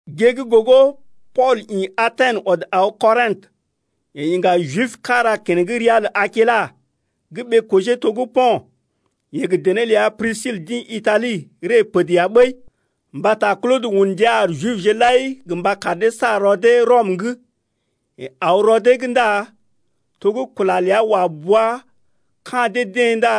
Gée gə́ gogo Pool ḭ Aten ɔd aw Kɔrḭtə. Yeḛ iŋga Jib kára keneŋ ria Akila gə́ ɓee-kojee to gə́ Po̰t. Yeḛ gə dené ləa Prisil d’ḭ Itali ree pəd ya ɓəi mbata Klodə un ndia ar Jibje lai gə mba kar dee sa rɔ dee Rɔm’g. Yeḛ aw rɔ dee’g ndá to gə́ kula ləa wa bua ka̰ dee-deḛ ndá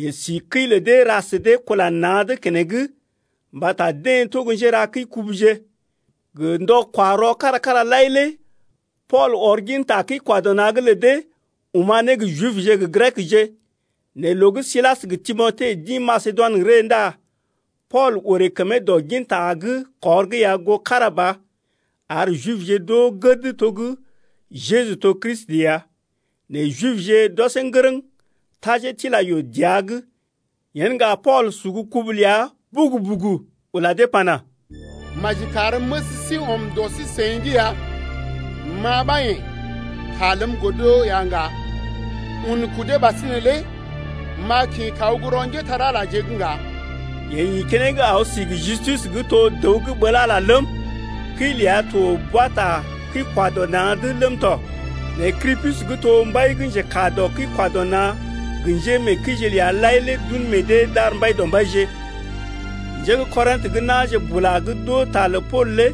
yeḛ si kəi lə dee ra sə dee kula na̰’d keneŋ mbata deḛ to gə́ njéra kəi-kubuje. Gə ndɔ-kwa-rɔ kára-kára lai lé Pool ɔr ginta kəi-kwa-dɔ-na̰’g lə dee oma̰ ne gə Jibje gə Grekje. Nɛ loo gə́ Silas gə Timote d’ḭ Masedoinə ree ndá Pool orè kəmee dɔ ginta gə́ kɔr’g ya goo kára ba, ar Jibje d’oo gəd to gə́ Jeju to Kristi ya. Nɛ Jibje d’ɔsee ŋgərəŋ tajee tila yoo dəa’g. Yen ŋga Pool sugu kubu ləa bugu-bugu ula dee pana: Maji kar məs sí ɔm dɔ sí-seḭ’g ya. Ma ɓa yḛ̀ ta ləm godo ya ŋga. Un kudee ɓasinè lé m’a kḭ kaw gə́ rɔ njépole-magəje’g ŋga. Yeḛ ḭ keneŋ aw si gə Justus gə́ to dəw gə́ ɓəl Ala lé ləm, kəi ləa to boa ta kəi-kwa-dɔ-na̰’d ləm tɔ. Nɛ Krispus gə́ to mbai gə́ njekaa dɔ kəi-kwa-dɔ-na̰ gə njémeekəije ləa lai lé d’un meḛ dee d’ar Mbaidɔmbaije. Njé gə́ Kɔrḭtə gə́ na̰je bula gə́ d’oo ta lə Pool lé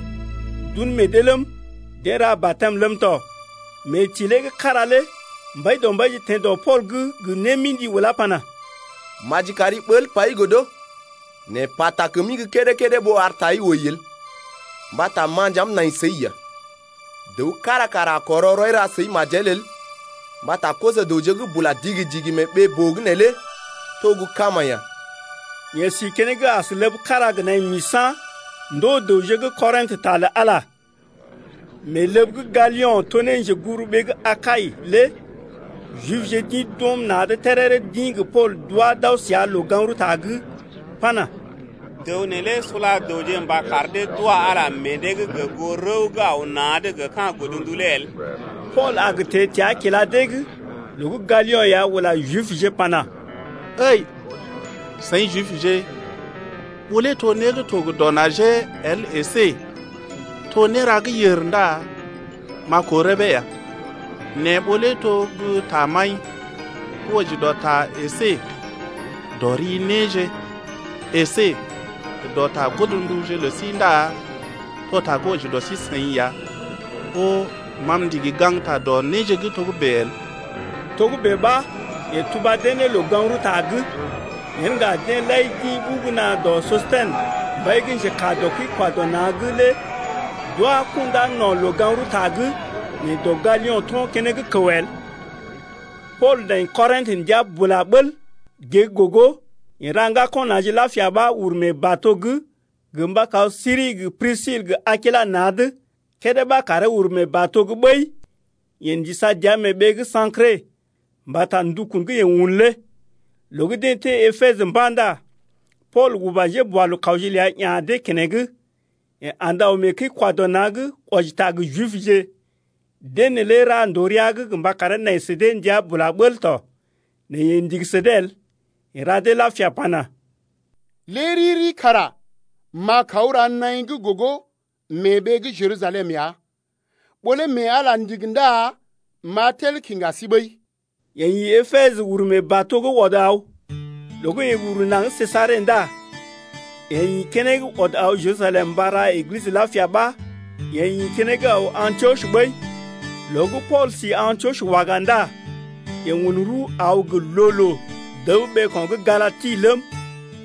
d’un meḛ dee ləm, deḛ ra batɛm ləm tɔ, Mee tilee gə́ kára lé Mbaidɔmbaije teḛ dɔ Pool’g gə némḭdi ulá pana: Maji kari ɓəl pai godo, nɛ pata kəmi gə́ kédé-kédé ɓó ar tai wəi el mbata ma nja m’nai səi ya. Dəw kára kara a kɔrɔ rɔi ra səi majel el mbata koso-dəwje gə́ bula digi-digi mee ɓee-boo’g neelé to gə́ kama ya. Yeḛ si keneŋ as ləb kára gə naḭ misa̰ ndoo dəwje gə́ Korintə ta lə Ala. Mee ləb gə́ Galio̰ to ne njeguburuɓee gə́ Akai lé Jibje d’ḭ d’ɔm na̰’d téréré d’ḭ gə Pool d’wá d’aw səa loo-gaŋg-rəwta’g pana: Dəw neelé sula dəwje mba kar dee d’wa Ala meḛ dee’g gə goo rəw gə́ aw na̰’d gə ka̰ godndu lé el. Pool a gə teḛ təa kila dee’g loo gə́ Galio̰ ya ula Jibje pana: Ǝi seḭ Jibje, ɓó lé to né gə́ to gə dɔ najee el əsé to néra gə́ yèr ndá m’a koo rəbee ya nɛ ɓó lé to gə́ tamaḭ gə́ wɔji dɔ ta əsé dɔ ri néje əsé gə dɔ ta godndu lə sí ndá to ta gə́ wɔji dɔ sí-seḭ ya ɓó ma m’ndigi gaŋgta dɔ néje gə́ togə́bè’g el. Togə́bè ɓa yeḛ tuba dee ne loo-gaŋg-rəwta’g. Yen ŋga deḛ lai d’ḭ ɓugu na̰ dɔ Sostɛnə, mbai gə́ njekaa dɔ kəi-kwa-dɔ-na̰’g lé d’wá kundá no̰ loo-gaŋg-rəwta’g nɛ dɔ Galio̰ to̰ keneŋ kəw el. Pool nai Korintə ndəa bula bəl. Gée gə́ gogo yeḛ ra ŋgako̰ na̰je lapia ɓa uru mee bato’g gə mba kaw Siri gə Prisil gə Akilas na̰’d. Kédé ɓa karee uru mee bato’g ɓəi yeḛ ndisa dəa mee ɓee gə́ Sa̰kre mbata ndukun gə́ yeḛ un lé. Loo gə́ deḛ teḛ Epesə mba̰ ndá Pool uba njéboalookawje ləa ya̰ dee keneŋ. Yeḛ andə aw mee kəi-kwa-dɔ-na̰’g wɔji ta gə Jibje. Deḛ neelé ra ndòo rəa’g gə mba karee nai sə dee ndəa bula bəl tɔ. Nɛ yeḛ ndigi sə dee el. Yeḛ ra dee lapia pana: Lé riri kara m’a kaw ra naḭ gə́ gogo mee ɓee gə́ Jerusalem ya. Ɓó lé mee Ala ndigi ndá m’a tel kiŋga sí ɓəi. Yeḛ ḭ Epesə uru mee bato’g ɔd aw. Loo gə́ yeḛ uru naŋg Sejare ndá yeḛ ḭ keneŋ ɔd aw Jerusalem mba ra Eglisə lapia ɓa yeḛ ḭ keneŋ aw Antiɔs ɓəi. Loo gə́ Pool si Antiɔs waga ndá yeḛ un rəw aw gə loo-loo dəb ɓeeko̰ gə́ Galati ləm,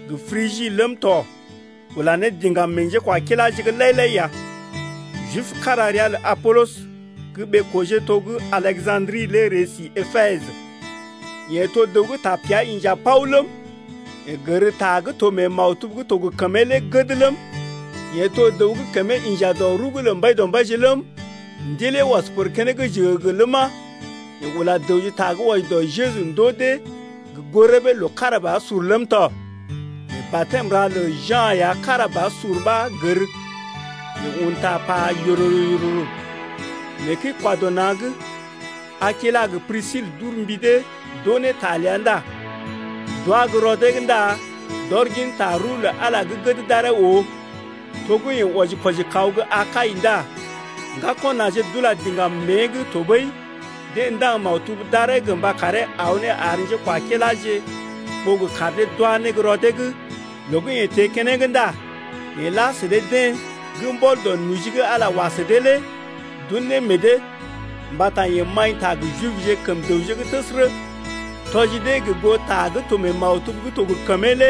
gə Prigi ləm tɔ ula ne diŋgam meḛ njékwakiláje’g lai-lai ya. Jib kára ria lə Apolɔs gə́ ɓee-kojee to gə́ Aleja̰dri lé ree si Epesə. Yeḛ to dəw gə́ tapea inja paw ləm, Yeḛ gər ta gə́ to mee maktub gə́ to gə kəmee lé gəd ləm, Yeḛ to dəw gə́ kəmee inja dɔ rəw’g lə Mbaidɔmbaije ləm, ndilee ɔs pər keneŋ jəgəgə ləma, yeḛ ula dəwje ta gə́ wɔji dɔ Jeju ndoo dee gə goo rəbee loo kára ba sur ləm tɔ. Nɛ batɛm ra lə Ja̰ ya kára ba sur ɓa gər. Yeḛ un ta pa yororo-yororo mee kəi-kwa-dɔ-na̰’g. Akilas gə Prisil d’ur mbi dee d’oo ne ta ləa ndá d’wá gə́ rɔ dee’g ndá d’ɔr ginta rəw lə Ala gə́ gəd d’aree oo. To gə́ yeḛ wɔji-kwɔji kaw gə́ Akai ndá ŋgako̰ na̰je d’ula diŋgam mée’g tɔɓəi deḛ ndaŋg maktub d’aree gə mba karee aw ne ar njékwakiláje ɓó gə kar dee d’wá ne gə́ rɔ dee’g. Loo gə́ yeḛ teḛ keneŋ ndá yeḛ la sə dee-deḛ gə́ mbɔl dɔ noji gə́ Ala wa sə dee lé d’un ne meḛ dee. Mbata yeḛ maḭta gə Jibje kəm dəwje’g təsərə tɔji dee gə goo ta gə́ to mee maktub gə́ to gə kəmee lé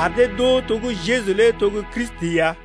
ar dee d’oo to gə́ Jeju lé to gə́ Kristi ya.